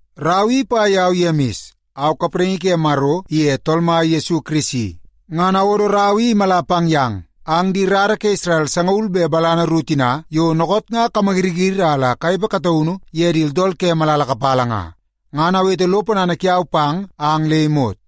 Rau i ipa yau Yemis. Au kapraingi ke Maro iye Tool Mai Yesu Kirisi. Ngan awodo rau i imala pang yang ang di rara ke Isrel sangaul be balana ru tina yo dookoot nga kamayiriyiri a la kanepe kataunu ye di tooltool ke malala kapala nga. Ngan awete lo ponana kiau pang ang le imot.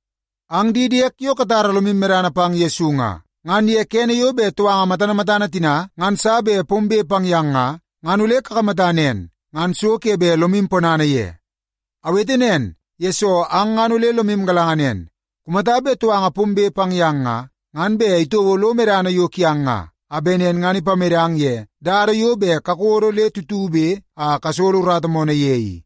Ang di diek yo katara lomu medana pang Yesu nga, ngan kene yo bet touanga matana matana tina ngan sa bet pombe pang yang nga, ngan ole kakamata nen, ngan so ke bet lomu ponana ye. Awete nen, yesoo ang ngan ole lomu galanga nen, kumata bet touanga pombe pang yang nga, ngan bet itouo lo medana yo kiang nga, a bet nen ngan ipamedang ye dada yo bet kakodo le tutube a kasolo urata moonoo ye i.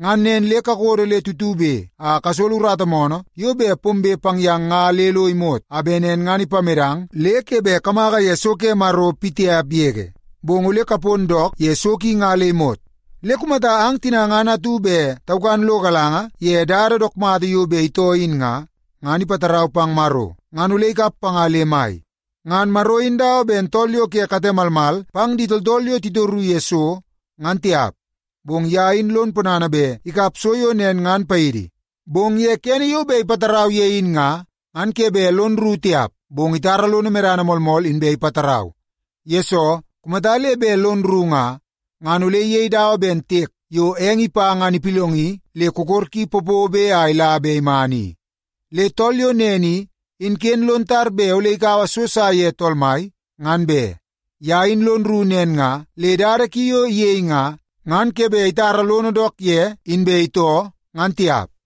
Ngan nen le kakodo le tutube a kasolo urata moonoo yo bet pombe pang yang nga le lo imot, a bet nen ngan ipamedang le ke bet kamaka ye so ke Maro pitiap yege, bong ole kapon dook ye so ki nga le imot. Le kumata ang tina ngan atu bet taukan lo galanga ye dada dook mata yo bet itoo in nga, ngan ipatarau pang Maro ngan ole ikap panga le mai. Ngan Maro in dawa ben tool yo katen malmal pang di tooltool yo titoru ye so, ngan tiap, bong ye in lon ponana bet ikap so yo nen ngan paidi. Bong ye kene yo bet ipatarau ye in nga, ngan ke bet lon rru tiap, bong itara lono medana moolmool inbe ipatarau. Yesoo, kumata le bet lon rru nga, ngan ole iyei dawa ben tiek yo eng ipa ngan ipillongi le kokor ki popobe a ila be iman i. Le tool yo nen i, in ken lon tar bet ole ikaua so sa ye Tool Mai, ngan be. Ye in lon rru nen nga le dada ki yo iyei nga, ngan ke bet itara lono dook ye inbe itoo, ngan tiap.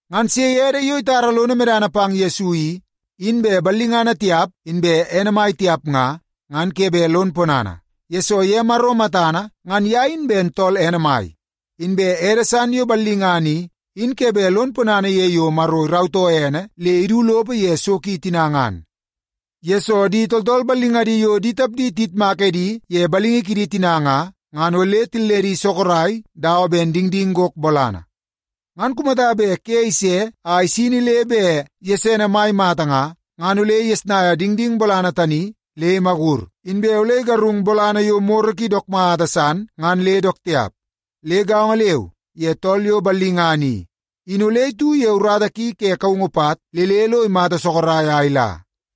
Ngan sei ede yo itara lono medana pang Yesu i, in bet ballingana tiap inbe ene mai tiap nga, ngan ke bet lon ponana, yesoo ye Maro matana ngan ye in ben tool ene mai. Inbe ede san yo ballingana i, in ke bet lon ponana ye yo Maro irautoo ene le idu lopo ye so ki tina ngan. Yesoo, di tooltool ballingadi yo di tapdi tiyitmak edi ye balingi kidi tina nga, ngan ole tilledi sorok dawa ben dingding gok bolana. Ngan kumata bet ke ise a isini le bet gesene mai mata nga, ngan ole igesnaia dingding bolana tani le imakur, inbe ole igarung bolana yo moro ki dook mata san ngan le dook tiap. Le gaongo leu ye tool yo ballingana i, in ole itu ye urata ki ke kaungu pat le le lo imata sorok a ila.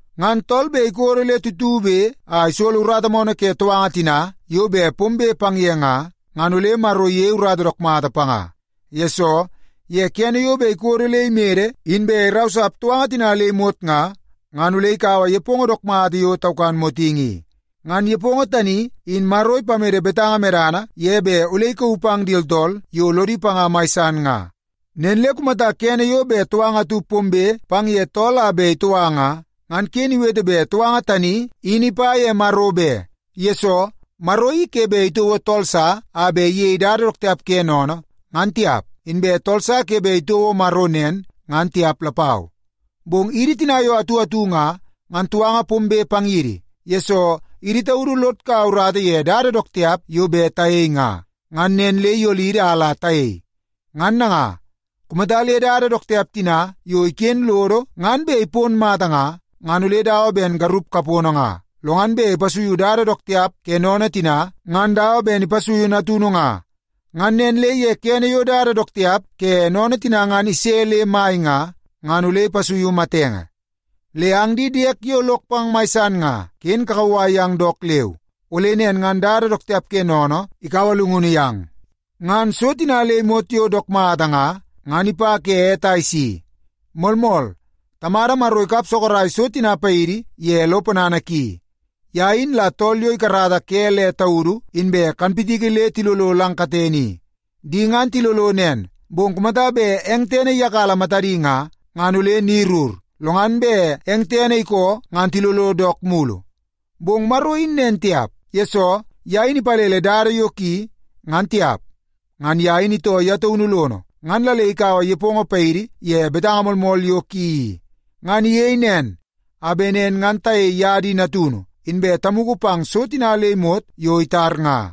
Ngan tool bet ikodo le tutube a isolo urata moonoo ke touanga tina yo bet pombe pang ye nga, ngan ole Maro iyei urata dook mata panga. Yesoo, ye kene yo bet ikodo le imede inbe irausap touanga tina le imot nga, ngan ole ikaua nepongo dook mata yo taukan motingi i. Ngan nepongo tani in Maro ipamede betanga medana ye bet ole ikauu pang di tooltool yo lodi panga mai san nga. Nen le kumata kene yo bet touanga atu pombe pang ye tool a bet itoua nga, ngan ken iwete bet touanga tani in ipa ye Maro be. Yesoo, Maro i ke bet itouo tool sa a bet iyei dada dook tiap ke sennene ngan tiap, inbe tool sa ke bet itouo Maro nen ngan tiap lapau. Bong idi tina yo atu atu nga, ngan touanga pombe pang yidi, yesoo idi taudu lod kaua urata ye dada dook tiap yo bet tayei nga, ngan nen le iyolidi a la tayei. Ngan nanga, kumata le dada dook tiap tina yo iken lodo ngan bet ipon mata nga, ngan ole dawa ben garup kapono nga, lo ngan bet ipasuiu dada dook tiap ke sennene tina ngan dawa ben ipasuiu natunu nga. Ngan nen le ye kene yo dada dook tiap ke sennene tina ngan ise le mai nga, ngan ole ipasuiu matenge. Le ang di diek yo lok pang mai san nga, ken kakauwai yang dook leu, ole nen ngan dada dook tiap ke sennene ikaua llungunu yang. Ngan so tina le imot yo dook mata nga, ngan ipa ke ete a isi. Moolmool, Tamada Maro ikap sorok so tina paidi ye lo ponana ki. Ye in la tool yo ikarata ke le taudu inbe kanpitiki le tilolo lang katene i. Di ngan tilolo nen, bong kumata bet eng tene iyakala matadi nga, ngan ole ni rur, lo ngan bet eng tene ikoo ngan tilolo dook mulu. Bong Maro in nen tiap, yesoo ye in ipalele dada yo ki ngan tiap. Ngan ye in itoo ye taunu lono, ngan la le ikaua nepongo paidi ye betanga moolmool yo ki i. Ngan iyei nen a bet nen ngan tayei ye di natunu, inbe tamugu pang so tina le imot yo itar nga.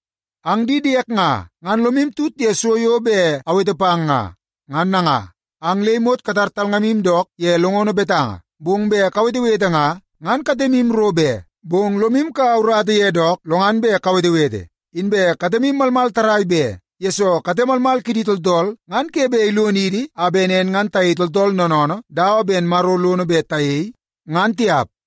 Ang di diek nga, ngan lomu tut ye so yo bet awete pang nga. Ngan nanga, ang le imot katar talngamu dook ye longono betanga, bong bet kawetewete nga, ngan katemu ro be, bong lomu kaua urata ye dook lo ngan bet kawetewete. Inbe katemu malmal tarrai be, yesoo kate malmal kidi tooltool ngan ke bet ilonidi a bet nen ngan tayei tooltool noonoonoo dawa ben Maro lono bet tayei, ngan tiap.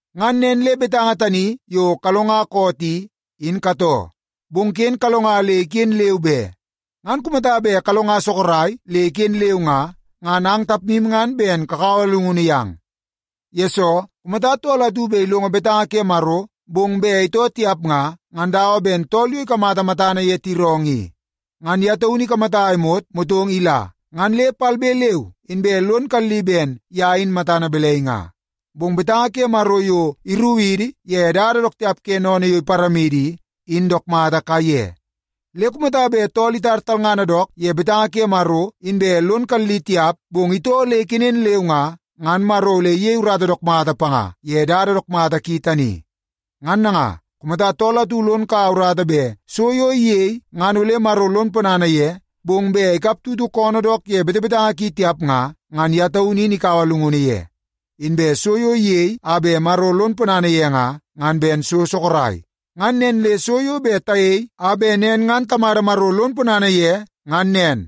Ngan nen le betanga tani yo kalonga koot i, in katoo. Bong ken kalonga le iken leu be. Ngan kumata bet kalonga sorok le iken leu nga, ngan ang tapmu ngan ben kakaua llungunu yang. Yesoo, kumata tool atu bet ilongo betanga ke Maro, bong bet itoo tiap nga, ngan dawa ben tool yo ikamata matana ye tiroongoo i. Ngan ye taunu ikamata a imot motong ila, ngan le palbe leu inbe lon kalli ben ye in matana balai nga. Bong betanga ke Maro yo irukidi ye dada dook tiap ke sennene yo iparamidi i, in dook mata kaiye. Le kumata bet tool itar talngana dook ye betanga ke Maro inbe lon kalli tiap, bong itoo le ikenen leu nga, ngan Maro ole iyei urata dook mata panga ye dada dook mata ki tani. Ngan nanga, kumata tool atu lon kaua urata bet so yo iyei ngan ole Maro lon ponana ye, bong bet ikap tutu koonoo dook ye betebetanga ki tiap nga, ngan ye taunu in ikaua llungunu ye. Inbe so yo iyei a bet Maro lon ponana ye nga, ngan ben so sorok. Ngan nen le so yo bet tayei a bet nen ngan Tamada Maro lon ponana ye ngan nen.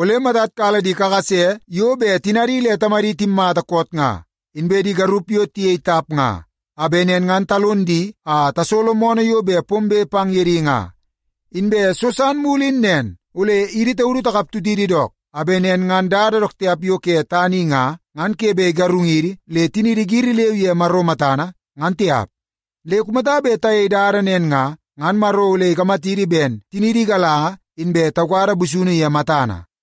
Ole matad kala di kakase yo tinadi le tamadi timmata koot nga, inbe di garup yo tiyei tap nga, a bet nen ngan talon di a tasolo moonoo yo bet pombe pang ye di nga. Inbe so san mulu in nen, ole idi taudu takap tutidi dook, a bet nen ngan dada dook tiap yo ke tana i nga, ngan ke bet igarungidi le tiniidi giri leu ye Maro matana, ngan tiap. Le kumata bet tayei dada nen nga, ngan Maro ole ikamatidi ben tiniidi igalanga inbe taukada busunu ye matana.